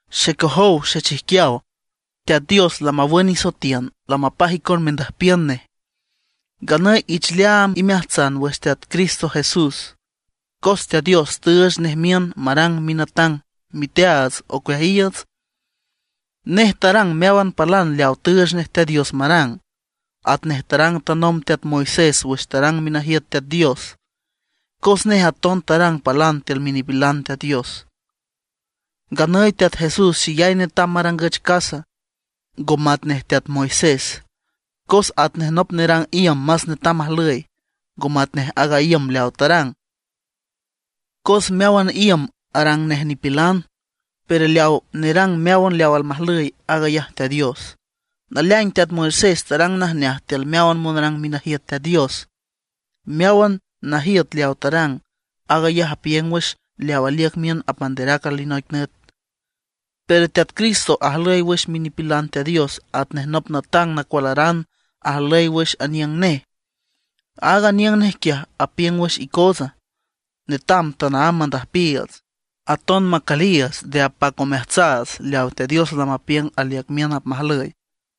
Xecojow xechijquiaw, Teat Dios lamawün isoetiün, lamapaj icon mendüjpiün nej; nganüy ich leaam imeajtsan wüx Teat Cristo Jesús, cos Teat Dios tüüch nej miün marang minatang miteaats ocueajiiüts. Nej tarang meáwan palan leawa tüüch nej Teat Dios marang, atnej tarang tanomb teat Moisés wüx tarang minajiüt Teat Dios, cos nej aton tarang palan tiül minipilan Teat Dios. Nganüy Teat Jesús xeyay netam marangüch casa, ngo matnej teat Moisés, cos atnej nop nerang iüm más netam ajlüy, ngo matnej aaga iüm leawa tarang. Cos meáwan iüm arang nej nipilan, pero leawa nerang meáwan leaw almajlüy, aag ayaj Teat Dios. Naleaing teat Moisés tarang najneaj tiül meáwan monrang minajiüt Teat Dios. Meáwan najiüt leaw tarang, aag ayaj apiüng wüx leaw aliüc miün apmanderac alinoic nüt. Pero Teat Cristo ajlüy wüx minipilan Teat Dios atnej nop natang nacualaran ajlüy wüx aniüng nej. Aaga aniüng nej quiaj apiüng wüx icootsa. Netam tanaámb mandüjpiiüts, aton macüliiüts nde apac omeajtsaats leawa Teat Dios lamapiüng aliüc miün apmajlüy.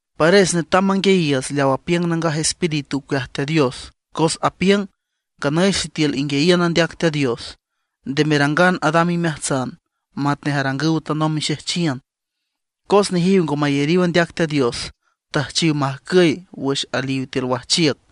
Pares netam manguiayiiüts leaw apiüng Nangaj Espíritu ocueaj Teat Dios, cos apiüng: Nganüy sitiül inguiayiün andeac Teat Dios, nde merangan adam imeajtsan matnej tarangüw tanomb mixejchiün, cos nejiw ngo mayariw andeac Teat Dios, tüjchiw majcüy wüx aliw tiül wajchiüc.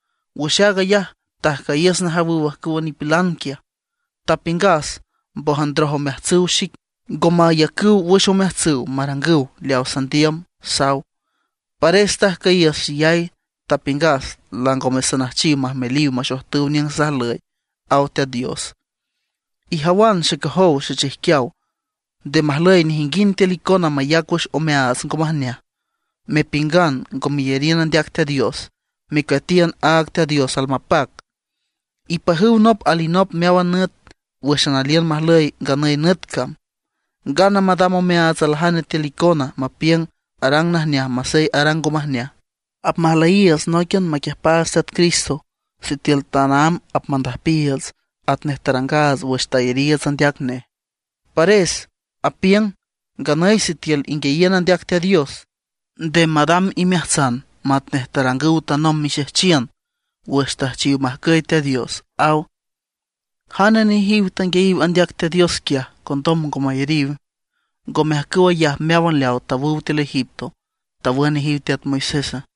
Wüx aag ayaj tajcüyiüs najawüw ajcüwa nipilan quiaj, tapiüngas: “Mbójan ndroj omeajtsüw xic, ngo mayacüw wüx omeajtsüw marangüw leaw sandiüm”, saw. Pares tajcüyiüs xeyay, tapiüngas: “Langome sanüjchiw majmeliw maxojtüw niüng sajlüy”, aw Teat Dios. Ijawan xecojow xechijquiaw, nde majlüy nejinguind tiül icona mayac wüx omeaats ngo majneaj, mepiüngan ngo meyariün andeac Teat Dios, mecueatiün aaga Teat Dios almapac. Ipajüw nop alinop meáwan nüt wǘxan aliün majlüy nganüy nüt cam, ngana madam omeaats aljane tiül icona mapiüng arang najneaj masey arang ngo majneaj. Apmajlüyiiüts nóiquian maquiüjpaats Teat Cristo sitiül tanaámb apmandüjpiiüts atnej tarangaats wüx tayariiüts andeac nej. Pares apiüng: Nganüy sitiül inguiayiün andeac Teat Dios, nde madam imeajtsan matnej tarangüw tanomb mixejchiün, wüx tüjchiw majcüy Teat Dios, aw. ¿Jane nejiw tanguiayiw andeac Teat Dios quiaj, condom ngo mayariw? ¿Ngome ajcüw ayaj meáwan leaw tawüw tiül Egipto, tawün nejiw teat Moisésa?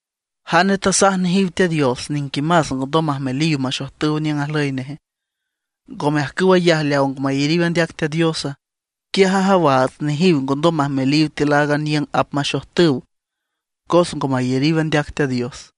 ¿Jane nejiw tasaj nejiw Teat Dios niquimas ngondom majmeliw maxojtüw niüng ajlüy neje? ¿Ngome ajcüw ayaja leaw ngo mayariw andeac Teat Diosa? Quiaj ajawaats nejiw ngondom majmeliw tiül aaga niüng apmaxojtüw, cos ngo mayariw andeac Teat Dios.